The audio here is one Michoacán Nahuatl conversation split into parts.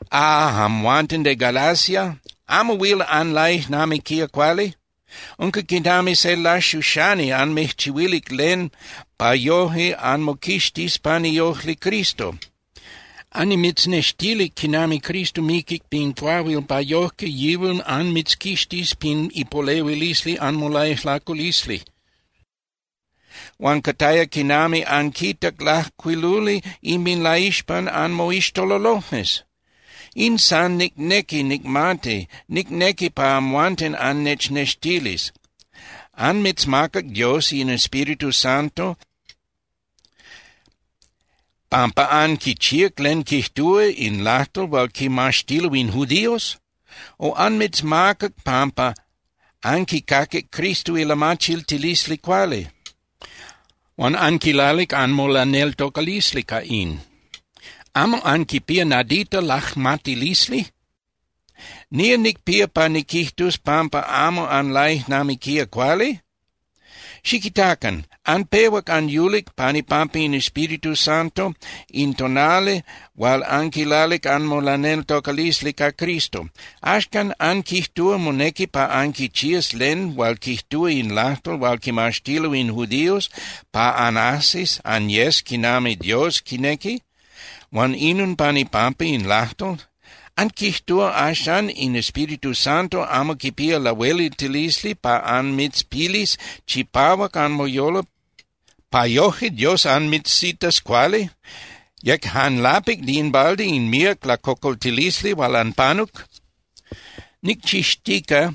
¡Ah, amhuanten de Galacia! ¿Amo huil anlaijnamiquía cuali? Unca quinami se laxuxani anmijchihuilic len pa yoje anmoquixtis pan iojli Cristo. Annimitznextilic quinami Cristo miquic pin cuahuil pa yojque yihual anmitzquixtis pin ipolehuilisli anmolaijlaculisli, huan cataya quinami anquitac lajcuiluli inminlaixpan anmoixtololojmes. In san nicnequi nicmati, nicnequi pa amhuanten annechnextilis: ¿Anmitzmacac Dios in Espíritu Santo pampa anquichíac len quijtúa in lajtol hual quimaxtilo in judíos? O ¿anmitzmacac pampa anquicaquic Cristo ilamachiltilisli cuali huan anquilalic anmolaneltocalisli ca in? ¿Amo anquipía nadita lajmatilisli? ¿Nía nicpía pa niquijtus pampa amo anlaijnamiquía cuali? Xiquitacan. Anpehuac anyulic pan ipampa in Espíritu Santo in tonali hual anquilalic anmolaneltocalisli ca Cristo. Axcan ¿anquijtúa monequi pa anquichías len hual quijtúa in lajtol hual quimaxtilo in judíos pa anajsis anyes quinami Dios quinequi, huan inon pan ipampa in lajtol? ¿Anquijtúa axan in Espíritu Santo amo quipía lahueliltilisli pa anmitzpilis chipahuac anmoyolo pa yojque Dios anmitzitas cuali? ¿Yec jan lapic (de in balde) in míac lacocoltilisli hual anpanuc? Nicchixtica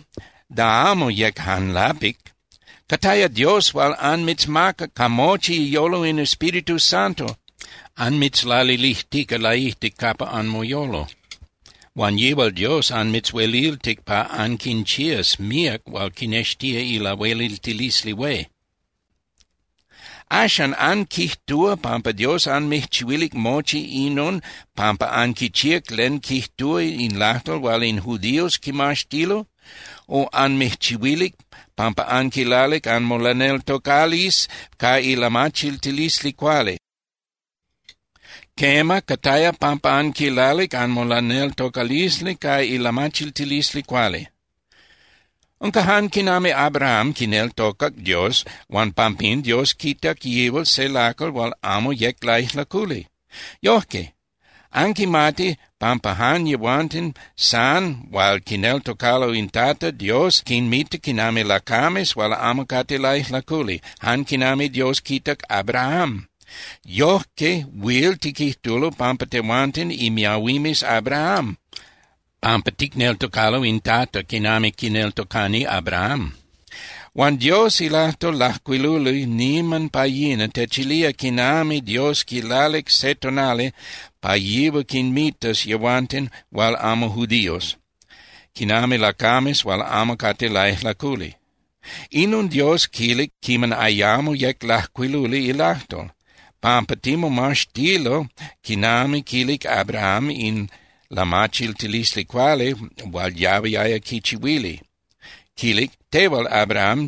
da amo yec jan lapic. Cataya Dios hual anmitzmacac ca mochi iyolo in Espíritu Santo, anmitzlalilijtica laijtic capa anmoyolo. Huan yihual Dios anmitzhueliltic pa anquinchías míac hual quinextía ilahueliltilisli hué. Axan, ¿anquijtúa pampa Dios anmijchihuilic mochi inon pampa anquichíac len quijtúa in lajtol hual in judíos quimaxtilo? O ¿anmijchihuilic pampa anquilalic anmolaneltocalisli ca ilamachiltilisli cuali? Quema, cataya pampa anquilalic anmolaneltocalisli ca ilamachiltilisli cuali. Unca jan quinami Abraham quineltocac Dios huan pampín Dios quitac yihual se lacal hual amo yec laijlaculi. Yojque, anquimati pampa jan yehuanten san hual quineltocalo in Tata, Dios quinmita quinami lacames hual amo cate laijlaculi, jan quinami Dios quitac Abraham. Yojque huil tiquijtulo pampa tehuanten imiahuimes Abraham pampa ticneltocalo in Tata quinami quineltocani Abraham. Huan Dios ilajtol lajcuiluli niman pa yina techilía quinami Dios quilalic se tonali pa yihual quinmitas yehuanten hual amo judíos quinami lacames hual amo cate laijlaculi. Inon Dios quilic quiman ayamo yec lajcuiluli ilajtol, pampa timomaxtilo quinami quilic Abraham in lamachiltilisli cuali hual yahuiaya quichihuili, quilic: “Tehual, Abraham,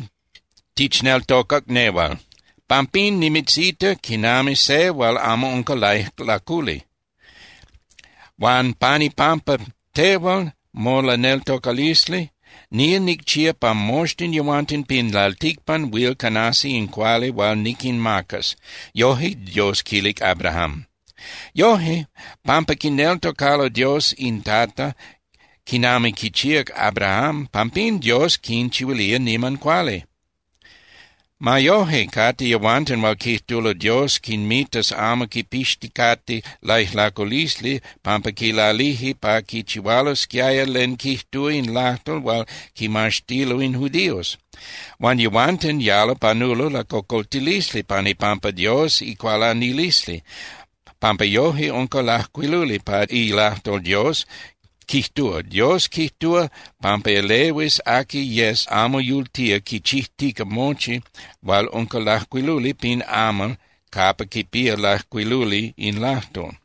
tichneltocac nehual, pampín nimitzita quinami se hual amo unca laijlaculi, huan pan ipampa tehual molaneltocalisli, nía nicchía pa moxtin yehuanten pin lalticpan huil canasi in cuali hual niquinmacas.” Yoje Dios quilic Abraham. Yoje, pampa quineltocalo Dios in Tata, quinami quichíac Abraham, pampín Dios quinchihuilía niman cuali. Ma yoje, cate yehuanten hual quijtulo Dios quinmitas amo quipixticate laijlaculisli pampa quilalije pa quichihualosquiaya len quijtúa in lajtol hual quimaxtilo in judíos. Huan yehuanten yalo panulo lacocoltilisli pan ipampa Dios icualanilisli, pampa yoje unca lajcuiluli pa ilajtol Dios, quijtúa: “Dios quijtúa pampa elehuis aqui yes amo yultía quichijtica mochi hual unca lajcuiluli pin amal capa quipía lajcuiluli in lajtol.”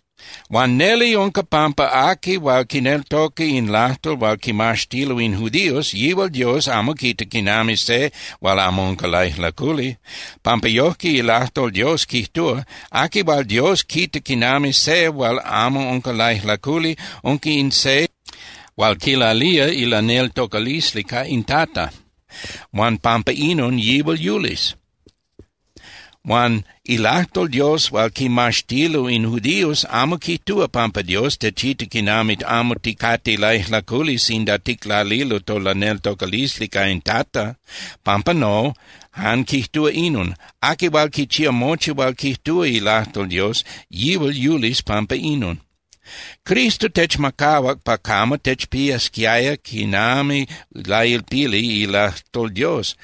Huan neli unca pampa aqui hual quineltoca in lajtol hual quimaxtilo in judíos, yihual Dios amo quita quinami se hual amo unca laijlaculi, pampa yojque ilajtol Dios quijtúa: “Aqui hual Dios quita quinami se hual amo unca laijlaculi unca in se hual quilalía ilaneltocalisli ca in Tata, huan pampa inon yihual yulis.” Huan ilajtol Dios hual quimaxtilo in judíos amo quijtúa pampa Dios techita quinami amo ticate laijlaculi sinda ticlalilo tolaneltocalisli ca in Tata. Pampa no, jan quijtúa inon: “Aqui hual quichía mochi hual quijtúa ilajtol Dios, yihual yulis pampa inon.” Cristo techmacahuac pa camo techpiasquiaya quinami lailpili ilajtol Dios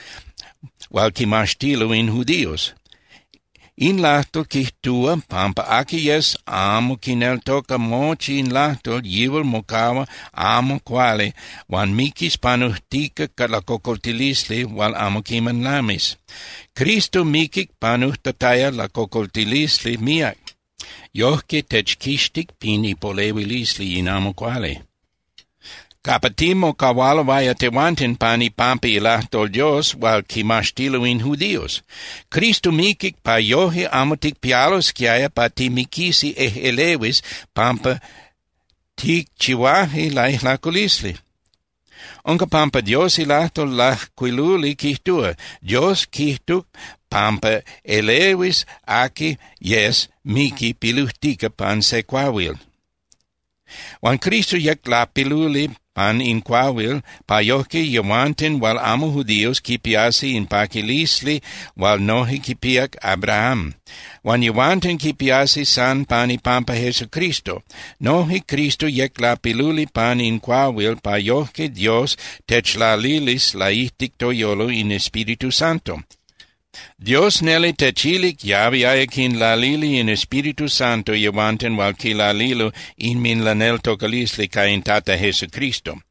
hual quimaxtilo in judíos. In lajtol quijtúa pampa aqui yes amo quineltoca mochi in lajtol, yihual mocahua amo cuali huan miquis panujtica lacocoltilisli hual amo quiman lamis. Cristo miquic panujtataya lacocoltilisli míac. Yojque techquixtic pin ipolehuilisli in amo cuali capa timocahualoaya tehuanten pan ipampa ilajtol Dios hual quimaxtilo in judíos. Cristo miquic pa yoje amo ticpialosquiaya pa timiquisi ejꞌelehuis pampa ticchihuaje laijlaculisli. Unca pampa Dios ilajtol lajcuiluli quijtúa: “Dios quijtuc pampa elehuis aqui yes miqui pilujtica pan se cuahuil.” Huan Cristo yec lapiluli pan in cuahuil pa yojque yehuanten hual amo judíos quipiasi in paquilisli hual noje quipíac Abraham. Huan yehuanten quipiasi san pan ipampa Jesucristo. Noje Cristo yec lapiluli pan in cuahuil pa yojque Dios techlalilis laijtic toyolo in Espíritu Santo. Dios neli techilic yahuiaya quinlalili in Espíritu Santo yehuanten hual quilalilo inminlaneltocalisli ca in Tata Jesucristo.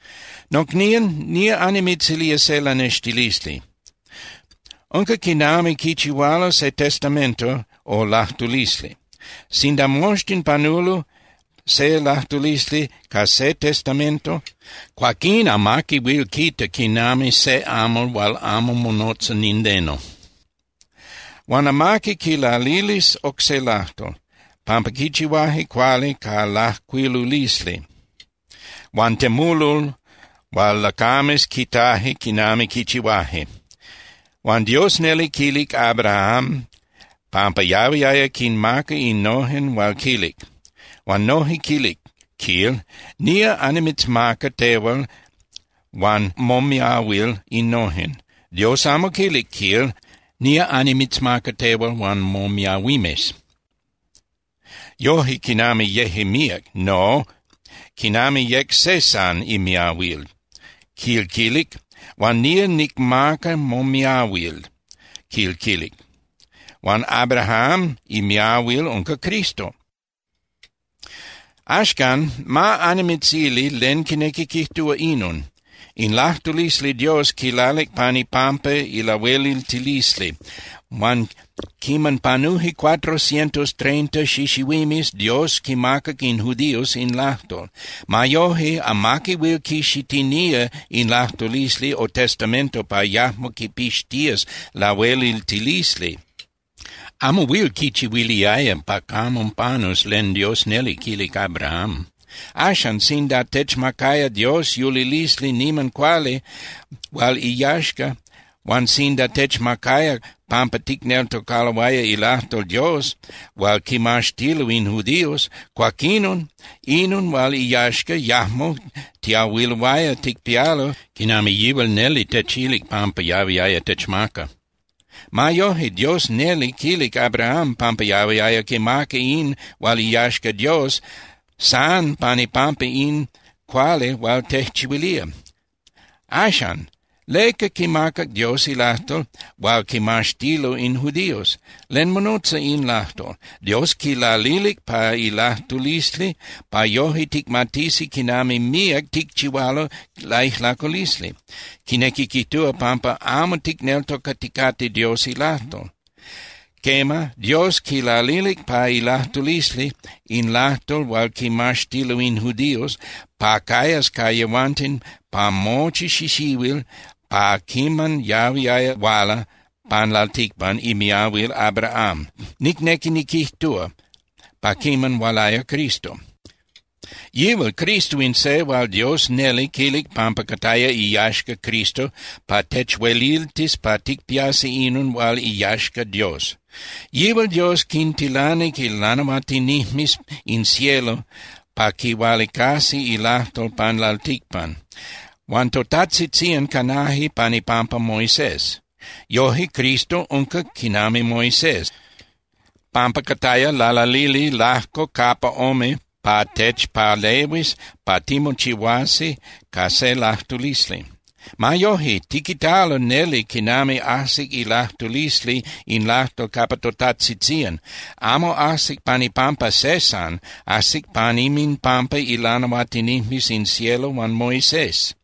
Nocnían, nía annimitzilía se lanextilisli. Unca quinami quichihualo se testamento o lajtulisli. Sinda moxtin panulo se lajtulisli ca se testamento, cuaquín amaqui huil quita quinami se amal hual amo monotza nindeno. Huan amaqui quilalilis oc se lajtol, pampa quichihuaje cuali ca lajcuilulisli huan temulol hual lacames quitaje quiman quichihuaje. Huan Dios neli quilic Abraham pampa yahuiaya quinmaca innojen hual quilic. Huan noje quilic, quil: “Nía annimitzmaca tehual huan momiahuil innojen.” Dios amo quilic, quil: “Nía annimitzmaca tehual huan momiahuimes”, yoje quinami yeje míac. No, quinami yec se san imiahuil, quil quilic: “Huan nía nicmaca momiahuil”, quil quilic. Huan Abraham imiahuil unca Cristo. Axcan, ma annimitzili len quinequi quijtúa inon: In lajtulisli Dios quilalic pan ipampa ilahueliltilisli. Huan quiman panuje cuatro cientos treinta xixihuimes, Dios quimacac in judíos in lajtol. Ma yoje, amaqui huil quixitinía in lajtulisli o testamento pa yajmo quipixtías lahueliltilisli. Amo huil quichihuiliaya pa camo panus len Dios neli quilic Abraham. Axan, sinda techmacaya Dios yulilisli niman cuali hual iyaxca, huan sinda techmacaya pampa ticneltocaloaya ilajtol Dios hual quimaxtilo in judíos, cuaquinon inon hual iyaxca yajmo tiahuiloaya ticpialo quinami yihual neli techilic pampa yahuiaya techmaca. Ma yoje, Dios neli quilic Abraham pampa yahuiaya quimaca in hual iyaxca Dios san pan ipampa in cuali hual tejchihuilía. Axan, ¿leca quimacac Dios ilajtol hual quimaxtilo in judíos? ¿Len monotza in lajtol? Dios quilalilic pa ilajtulisli pa yoje ticmatisi quinami míac ticchihualo laijlaculisli, quinequi quijtúa, pampa amo ticneltocaticate Dios ilajtol. Quema, Dios quilalilic pa ilajtulisli in lajtol hual quimaxtilo in judíos pa cayas ca yehuanten pa mochi xixihuil pa quiman yahuiaya huala pan lalticpan imiahuil Abraham, nicnequi niquijtúa, pa quiman hualaya Cristo. Yihual Cristo in se hual Dios neli quilic pampa cataya iyaxca Cristo pa techueliltis pa ticpiasi inon hual iyaxca Dios. Yihual Dios quintilanic ilanahuatinijmes in cielo pa quihualicasi ilajtol pan lalticpan, huan totajtzitzían canaje pan ipampa Moisés. Yoje, Cristo unca quinami Moisés, pampa cataya lalalili lajco capa ome pa techpalehuis pa timochihuasi ca se lajtulisli. Ma yoje, tiquitalo neli quinami ajsic ilajtulisli in lajtol capa totajtzitzían. Amo ajsic pan ipampa se san, ajsic pan inminpampa ilanahuatinijmes in cielo huan Moisés.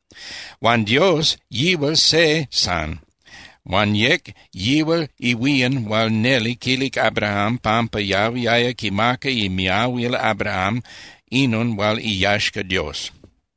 Huan Dios, yihual se san huan yec yihual ihuían hual neli quilic Abraham pampa yahuiaya quimaca imiahuil Abraham inon hual iyaxca Dios.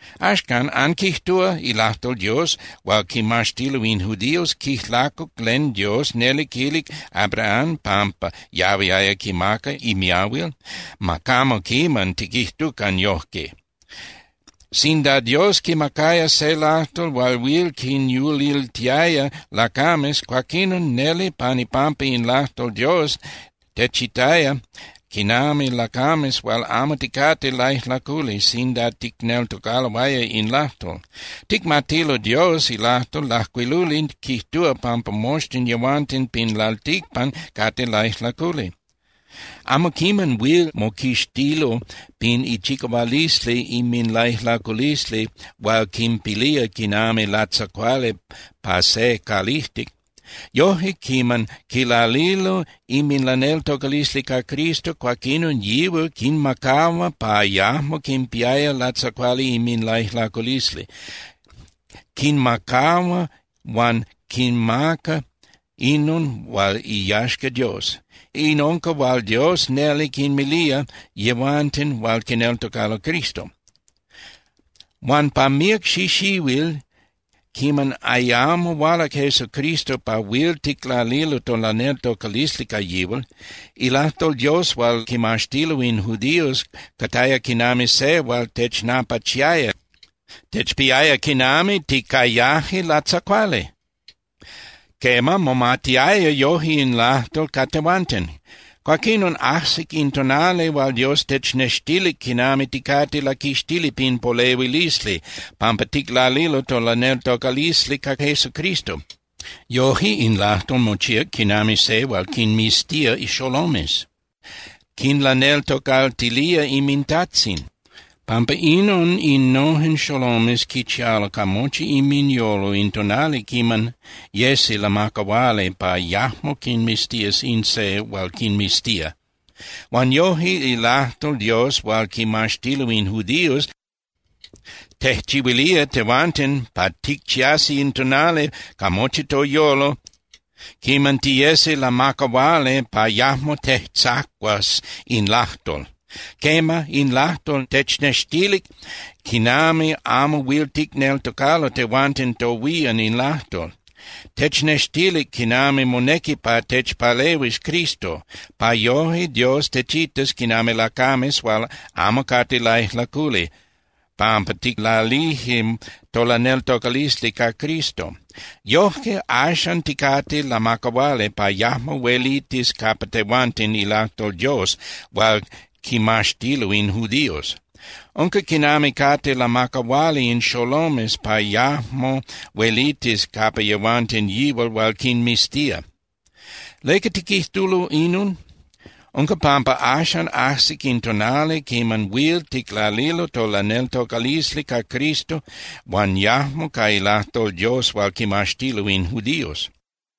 Axcan, ¿anquijtúa ilajtol Dios hual quimaxtilo in judíos quijlacuc len Dios neli quilic Abraham pampa yahuiaya quimaca imiahuil? ¡Ma camo quiman tiquijtucan yojque! Sinda Dios quimacaya se lajtol hual huil quinyuliltiaya lacames, cuaquinon neli pan ipampa in lajtol Dios techitaya quinami lacames hual amo ticate laijlaculi sinda ticneltocaloaya in lajtol. Ticmatilo Dios ilajtol lajcuiluli quijtúa pampa moxtin yehuanten pin lalticpan cate laijlaculi. Amo quiman huil moquixtilo pin ichicahualisli inminlaijlaculisli hual quinpilía quinami latzacuali pa se calijtic. Yoje, quiman quilalilo inminlaneltocalisli ca Jesucristo, cuaquinon yihual quinmacahua pa yajmo quinpiaya latzacuali inminlaijlaculisli. Quinmacahua huan quinmaca inon hual iyaxca Dios. In unca hual Dios neli quinmilía yehuanten hual quineltocalo Cristo. Huan pa míac xixihuil quiman ayamo hualac Jesucristo pa huil ticlalilo tolaneltocalisli ca yihual, ilajtol Dios hual quimaxtilo in judíos cataya quinami se hual technapachiaya, techpiaya quinami ticayaje latzacuali. Quema, momatiaya yoje in lajtol ca tehuanten. Cuaquinon ajsic in tonali hual Dios technextilic quinami ticate laquixtili pin polehuilisli pampa ticlalilo tolaneltocalisli ca Jesucristo. Yoje, in lajtol mochíac quinami se hual quinmiztía xolomes, quinlaneltocaltilía inmintajtzin. Pampa inon innojen xolomes quichialo ca mochi inminyolo in tonali quiman yesi lamacahuali pa yajmo quinmiztías in se hual quinmiztía. Huan yoje ilajtol Dios hual quimaxtilo in judíos tejchihuilía tehuanten pa ticchiasi in tonali ca mochi toyolo quiman tiyesi lamacahuali pa yajmo tejtzacuas in lajtol. Quema, in lajtol technextilic quinami amo huil ticneltocalo tehuanten tohuían in lajtol. Technextilic quinami monequi pa techpalehuis Cristo, pa yoje Dios techitas quinami lacames hual amo cate laijlaculi pampa ticlalije tolaneltocalisli ca Cristo. Yojque axan ticate lamacahuali pa yajmo huelitis capa tehuanten ilajtol Dios hual quimaxtilo in judíos. Unca quinami cate lamacahuali in xolomes pa yajmo huelitis capa yehuanten yihual hual quinmiztía. ¿Leca tiquijtulo inon? Unca pampa axan ajsic in tonali quiman huil ticlalilo tolaneltocalisli ca Cristo huan yajmo ca ilajtol Dios hual quimaxtilo in judíos.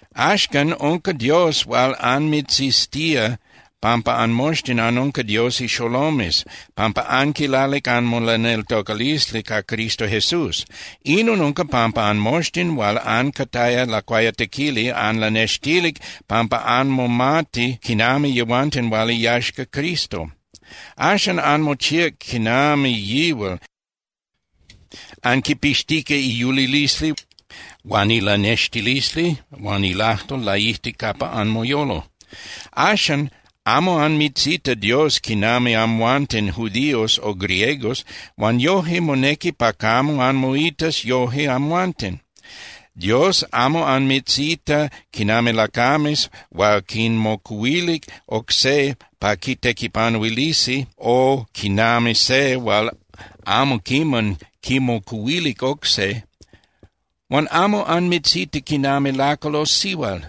Axcan, unca Dios hual anmitziztía pampa anmoxtin anunca Dios ixolomes pampa anquilalic anmolaneltocalisli ca Cristo Jesús. Inon unca pampa anmoxtin hual ancataya lacuayatequili anlanextilic pampa anmomati quinami yehuanten hual iyaxca Cristo. Axan anmochíac quinami yihual, anquipixtica iyulilisli huan ilanextilisli huan ilajtol laijtic capa anmoyolo. Axan amo anmitzita Dios quinami amhuanten judíos o griegos, huan yoje monequi pa camo anmoitas yoje amhuanten. Dios amo anmitzita quinami lacames hual quinmocuhuilic oc se pa quitequipanuilisi o quinami se hual amo quiman quimocuhuilic oc se. Huan amo anmitzita quinami lacal o sihual.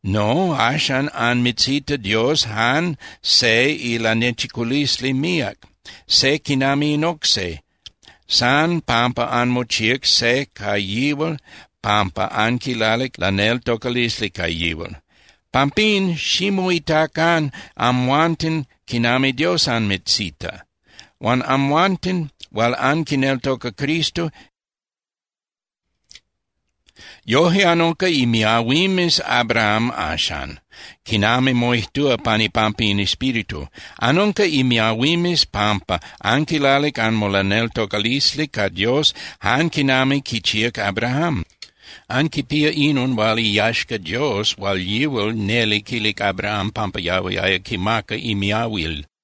No, axan anmitzita Dios jan se ilanechiculisli míac, se quinami in oc se, san pampa anmochíac se ca yihual pampa anquilalic laneltocalisli ca yihual. Pampín, ximoitacan amhuanten quinami Dios anmitzita. Huan amhuanten hual anquineltoca Cristo, yoje anunca imiahuimes Abraham axan, quinami moijtúa pan ipampa in Espíritu. Anunca imiahuimes pampa anquilalic anmolaneltocalisli ca Dios jan quinami quichíac Abraham. Anquipía inon hual iyaxca Dios hual yihual neli quilic Abraham pampa yahuiaya quimaca imiahuil.